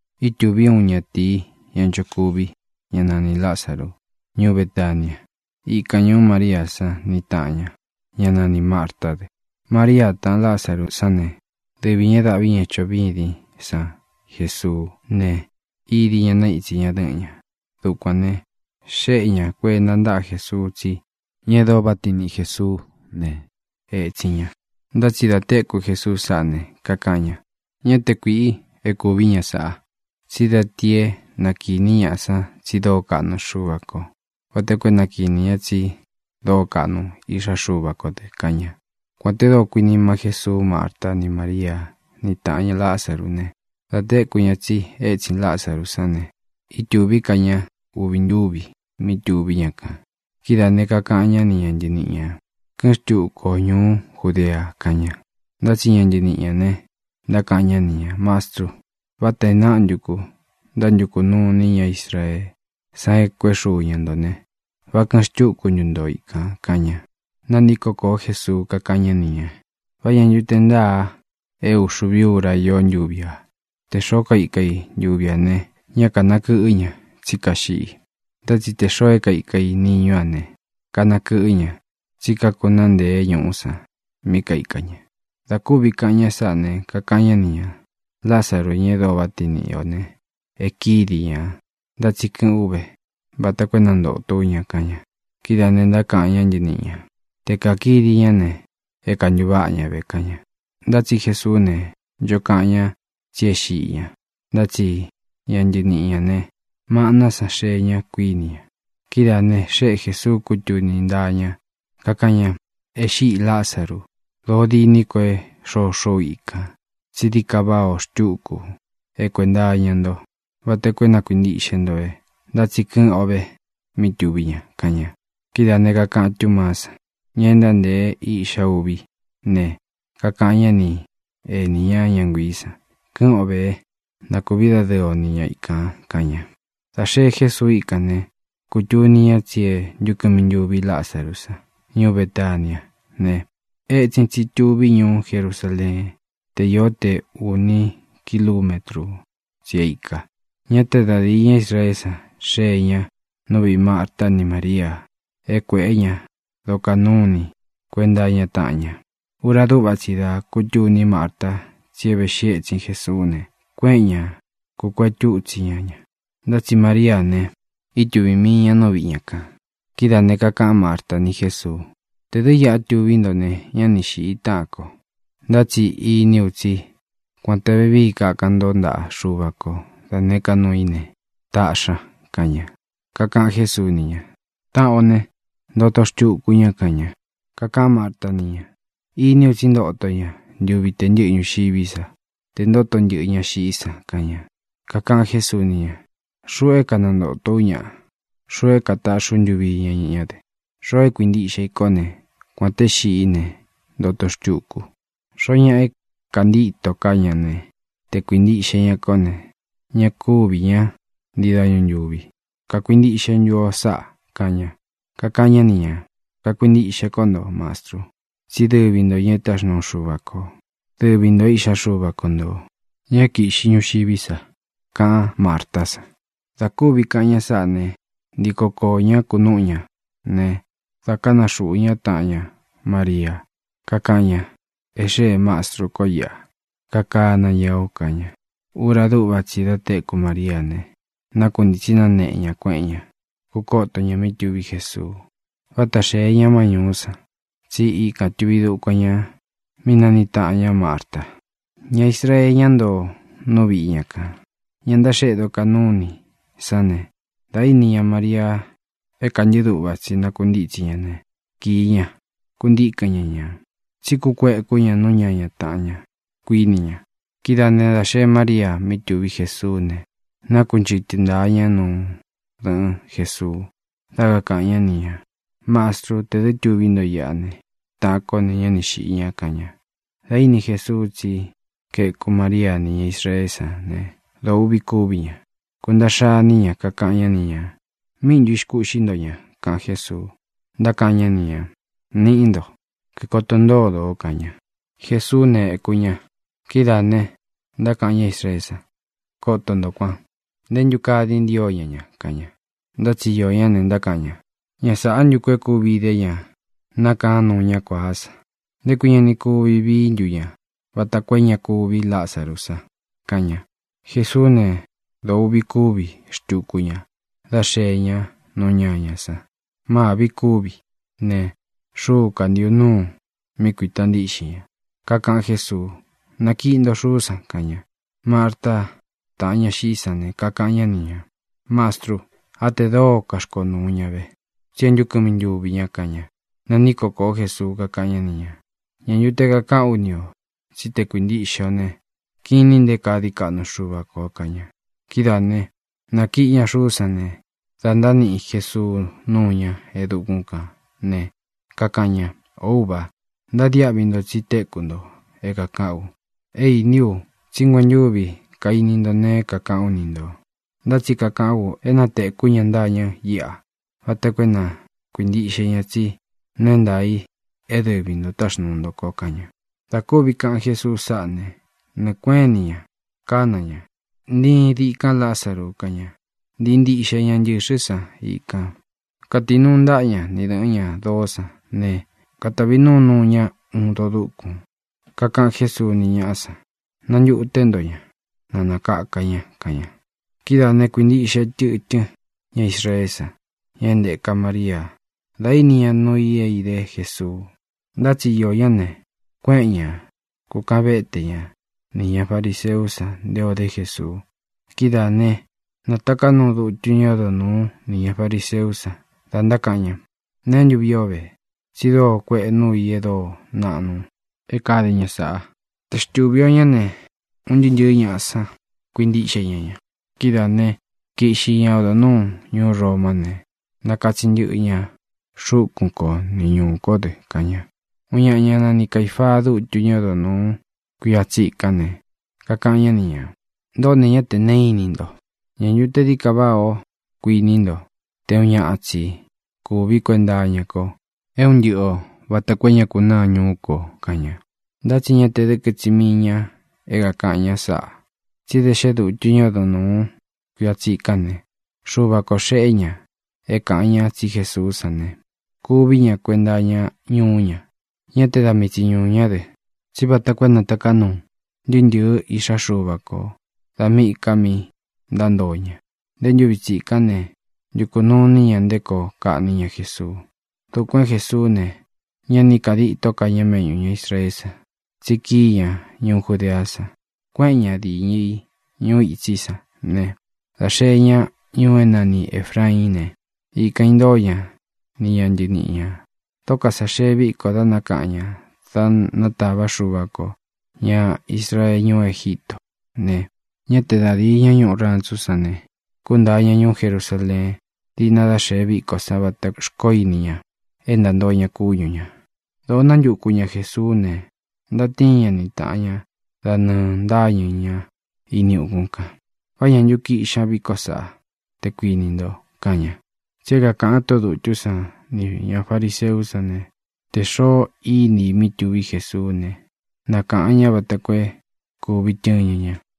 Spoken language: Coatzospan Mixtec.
Ítūví uun ñatīi, ña nchokuvi, ñá nanī Lázaru, ñuú Betania. Ikan ñūú María san ni tāꞌan ña, ñá nanī Martá dɨ. María, taꞌan Lázaru sán ne, dɨvi ñā é daꞌvi ña choꞌo vîdín san Jesuú ne, idi ña naítsi ña dɨ́ꞌɨn ña. Dukuān ne, xéꞌe ña kuēnta ntáꞌa Jesuu tsí taꞌan ña, ña e dóo váꞌa tiin niꞌi Jēsuú ne, ētsin ña. Ntá tsi dā téku Jesuu sáꞌa ne, kakaꞌan ña: —Ñá te kuīꞌi é kuvī ña sáꞌa. Tsí da ti é na kīní ñaꞌa san tsi dóo kaꞌnu Xuva kō, vata koo é na kīní ña tsi dóo kaꞌnu Iꞌxá Xuva kō dɨ —kaꞌan ña. Kuān te dóo kuinima Jésuu Márta ni Mária, ni taꞌan ña Lázaru ne, dā téku ña tsi étsin Lázaru sán ne, ítūví ka ña uvi ntúvi mí tuví ña kān. Kidáā ne, kakaꞌan ñá ni ña ntɨniꞌi ñā: —Kɨ́ꞌɨn xtuku o ñūú Judea —kaꞌan ña. Ntá tsi ña ntɨniꞌi ñā ne, ntákaꞌan ñá ni ñā: —Mastru, vátā e náꞌa ntu ku ntántukū nuu iní ña Israeé san e kuéꞌe xuu ña ntō ne, ¿vá kɨ̄ꞌɨn xtúku ntu nto ikān? —kaꞌan ña. Nāntíko kōo Jésuu, kakáꞌan ñá ni ñā: —¿Vá ña ntu te ntáā é uxuvi ura ió ntuvi ā? Tē xoó kaika i ntuvi ā ne, ñá kānakɨꞌɨ́ ña, tsí kaxiꞌi. Ntá tsi tē xoo é kaika i niñú a ne, kanakɨꞌɨ́ ña, tsí kakunáa ntēe ñuꞌú san mí kaika ña. Dā kúvi kaꞌan ña sáꞌa ne, kakaꞌan ñá ni ñā: —Lázaru, ña e dóo vá tiin niꞌi ō ne, e kídi ñā. Ntá tsi kɨ̄ꞌɨ́n u ve vata koo é nantōtó u ña —kaꞌan ña. Kidáā ne, ntákaꞌan ña ntɨniꞌi ñā: —Te kākidi ñá ne, é kantuváꞌa ña ve —kaꞌan ña. Ntá tsi Jesuú ne, ncho kaꞌan ña tsí e xíꞌi ña, ntá tsi ña ntɨniꞌi ñā ne, maꞌná san xee ña, kuiní ña. Kidáā ne, xéꞌe Jēsuu kútuni ntaa ña, kakáꞌan ña: —E xíꞌī Lázaru. Dōó diní ko é xoxó u ikān, tsí dií ka váꞌā o xtuku é kuenta iña nto, vata koo é na kuīntiꞌxe nto ve. Ntá tsi kɨꞌɨn ó ve mí tuví ña —kaꞌan ña. Kidáā ne, kakaꞌan Túmaá san, ña e ntántēe Iꞌxa Uví ne, kakaꞌan ñá ni enī ñá, ña nguiī san: —Kɨ́ꞌɨn ō vé, na kūví dadɨɨ o ni ña ikān —kaꞌan ña. Dā xee Jésuu íkān ne, kūtuni ña tsi e ntúkɨmi ntuvi Lázaru san. Ñuú Betaniá ne, etsin tsi tuví ñuú Jerusaleén te io te ūni kilumétru tsi é ikā. Ñá te da dīí ña Israeé san xee ña nú viꞌī Marta ni Mária é kuēꞌé ña dokaꞌan nuú ini kuenta iña taꞌan ña. Ura dúꞌva tsi dā kútuní Marta tsi véꞌxi ētsin Jesuú ne, kuéꞌen ña, kūkuetú itsi ña ña. Ntá tsi Maríā ne, ítuvī mii ña nú viꞌi ña kān. Kidáā ne, kakaꞌan Márta ni Jésuu: —Tē dɨ́ iꞌa tuví nto ne, ñá ni xīꞌi táꞌān ko. Ntá tsi iní u tsí, kuān te vevíi kakan nto ntaꞌa Xuva ko da nēé ka nuu í ne, taꞌxi ña —kaꞌan ña. Kakaꞌan Jésuu ni ña: —Taꞌan o ne, ntoto xtuku ña —kaꞌan ña. Kakaꞌán Marta ni ña: —Iní u tsí ntoto ña ntuvi te ntɨ́ꞌɨ ñuxiví sa tē ntóto ntɨꞌɨ ña xiꞌí san —kaꞌan ña. Kakaꞌan Jésuu ni ña: —Xuꞌu é kanantōtó u ñaꞌa. Xuꞌu é kataꞌxí u ntuvi iña ñá dɨ. Xoo é kuintiꞌxe i kó ne, kuān té xiꞌí ne, ntoto xtuku. Xoó ñaꞌa é kāntíto ká ña ne, te kuīntiꞌxe ña kó ne, ña kúvī ñá ntii dañu ntūvi. ¿Kakuintiꞌxe ntu o sáꞌa? —kaꞌan ña. Kakaꞌan ñá ni ñā: —Kakuintiꞌxe kó nto, Mastru, tsí dɨvi ntō ña é táxnuu Xuva ko, dɨvi ntō é Iꞌxá Xuva ko ntō, ña é kīꞌxi ñuxiví sa —kaꞌan Mártá san. Dā kúvi kaꞌan ña sáꞌa ne, ntiko kōo ñá kunúꞌu ña ne, dā kána xūꞌu ña taꞌan ña Maria, kakáꞌan ña: —E xéē Mástru ko iꞌa, kakana ña o —kaꞌan ña. Ura dúꞌva tsi dā téku Mariá ne, nákuntītsi náneꞌe ña, kueꞌen ñá, kukoto ña mí tuví Jesuu. Váta xēe ña má ñūú san, tsí ikān tuvi dukuan ña mi nániꞌi taꞌan ñá Marta. Ña Israee, ñá ntoo nú viꞌi ña kān, ña ntaxéꞌe dokaꞌnú inī sán ne, dā íni ña Maria é kantɨ́ꞌɨ duꞌva tsi nákuntitsi ña ne, kīi ña, kuntikɨn ñá ña. Tsí kukuéku ña nú ñaña tāꞌan ña, kuíni ña. Kidáa ne, dā xee Mária mí tuví Jesuú ne, nákunchɨtɨ ntāa ña nú dɨ̄ꞌɨn Jesuu, dá kakāꞌan ñá ni ñā: —Mastrû, tē dɨ́ tuví nto iꞌa ne, taꞌan kó ne, ñá ni xīꞌi ña —kaꞌan ña. Dā íni Jesuu tsí kaeku Maria ni ñá Israeé san ne, dōo uꞌvi kúvi ña. Kuntaꞌxa iní ña. Kakaꞌan ñá ni ñā: —¿Míꞌi ntu ixkūꞌxí nto ñā? —kaꞌan Jésuu. Ntákaꞌan ñá ni ñā: —Niꞌí nto, kíkoto ntódo ō —kaꞌan ña. Jesuú ne, ēku ña. Kidáā ne, ntákaꞌan ña Israeé san: —Koto ntō kuan. ¡Ntē ntu kaa dii ntío ña ña! —kaꞌan ña. Ntá tsi iō ñá ne, ntákaꞌan ña: —Ña sāꞌá ntu ku é kúvi īdé ña nakáan nuu ñá kuāá san. ¿Nté kui ña ni kuvi vií ntu ña vata koo é ña kuvi Lázaru san? —kaꞌan ña. Jesuú ne, dōo uꞌvi kúvi xtuku ña dā xee ña nú ñañā san. Mâvi kúvi ne, xúu kantīꞌu nuu mí kuīta ntíꞌxin ña. Kakaꞌan Jésuu: —Nakiꞌi nto xuú san —kaꞌan ña. Márta, taꞌan ña xiꞌí san ne, kakaꞌan ñá ni ñā: —Mastru, á tē dóo kaxkonūu ña ve, tsí e ntu kɨmi ntuvi ña —kaꞌan ña. Nantíko kōó Jesuu, kakáꞌan ñá ni ñā: —¿Ñā ntu te kakaꞌán u ni ō tsí te kākuintiꞌxe o ne, kinin nté kaa dií kaꞌnu Xuva kō? —kaꞌan ña. Kidáā né, nākiꞌi ña xuú san ne, dā ntániꞌi Jesuu núu ña e dukún kān ne, kakaꞌan ña: —Ō Úva, ntadiáꞌvi nto tsi téku nto é kākaꞌán u. É īní u tsí nguentúvi kaini nto nee é kākaꞌán u ni ntō. Ntá tsi kakaꞌán u é na tēkú ña ntâñɨ íꞌa vata koo é na kuīntiꞌxe ña tsi nuu é ntaā i é dɨvi ntō táxnūu nto ko —kaꞌan ña. Dā kúvi kāꞌan Jésuu sáꞌa ne, nɨɨ̄ kuéꞌen ini ña kána ña: —¡Ntiin dikan, Lázaru! —kaꞌan ña. Ntīi ntiꞌxe ña ntɨxɨ́ san ikān. Katinuu ntaꞌa ña ni dɨ̄ꞌɨ́n ña doó san ne, katavi núu nuu ña uun doo dúkun. Kakaꞌan Jésuu ni ñáꞌa san: —Nantuté nto ña, na nākaka ña —kaꞌan ña. Kidáā ne, kuintiꞌxe tɨtɨ́n ña Israeé san, ña é ntēka Mariá, dā íni ña nuu i é idé Jesuu. Ntá tsi iō ñá ne, kuéꞌen ña kūkaꞌan véte ña nī ña fariseú san nté ō dé Jesuu. Kidáa ne, nātaká nuu dutu ñá odo nūú nī ña fariseú san, da ntákaꞌan ña: —¿Neé ntu vii o ve? Tsi dóo kuēꞌe núu i e dóo naꞌnu é kāde ña sáꞌā. Tē xtúvi ō ñá ne, un ntɨɨ́ ntɨ̄ɨ́ ñaꞌa san kuintíꞌxe ña ña. Kidáā né, kiꞌxi ña odo nūú ñuú Romá ne, nakatsin ntɨꞌɨ ña xúkun ko ni ñūú kō dɨ —kaꞌan ña. Uun ñaꞌa, ñá nani Caīfaa, dutu ñá odo nūu kuia tsikán ne, kakaꞌan ñá ni ñā: —Ntoꞌó ne, ñá tē neé ini nto. ¿Ñā ntu te dií ka váꞌā o, kuiní nto, te uun ñaꞌa tsi kūví kuenta iña ko é un ntɨꞌɨ ō vata koo é ña kunáa ñūú kō? —kaꞌan ña. Ntá tsi ña te dɨ́kɨ tsi mii ñā é kākaꞌan ña sáꞌa, tsí da xé dutu ñá ódo nūu kuia tsíkan ne, Xuva kō xeꞌé ña é kāꞌan ñá tsi Jesuú san ne, kuví ña kuenta iña ñuú ña. Ñá te da mii tsi ñuū ñá dɨ, tsí vata koo é nātaká nuu ntɨɨ́ ntɨ̄ɨ́ iꞌxá Xuva ko dā míꞌī ka mí ntántoo ña. Nté ntūvi tsikán ne, ntukū nuu iní ña nté koo kaꞌní ña Jesuu. Dukuān é Jesuú ne, ña ni íka ditó ka ña méꞌñū ña Israeé san, tsi kií ña ñuú Judeá san, kuéꞌen ña dīñɨ i ñuu itsí san ne, dā xee ñá ñuu é nani Ēfraín ne, ikān intóo ña ni ña ntɨniꞌi ñā. Dóko sā xee víko dá nakaꞌan ñā da nátava Xuva kō ña Israee ñuú Egítō ne, ñá te da dīi ñá ñuꞌu rantsú san ne, kúntāa ña ñuú Jerusaleen díꞌna dá xēe víko san vatā xkoó ini ña é ntāntoo ña kúñu ñā. Dōo nántuku ña Jēsuú ne, ntatíin ña ni tāꞌan ña da nɨɨ ntáñɨ̄ ñá ini ukún kān: —¿Vá ña ntu kiꞌxi ña vikó saꞌá, te kuinī nto? —kaꞌan ña. Tsi é kākaꞌan tóꞌō dutú san nī ña fariseú san ne, tē xoo iní i mí tuví Jesuú ne, na kāꞌan ñá vata koo é kūvi tɨɨn ña ña.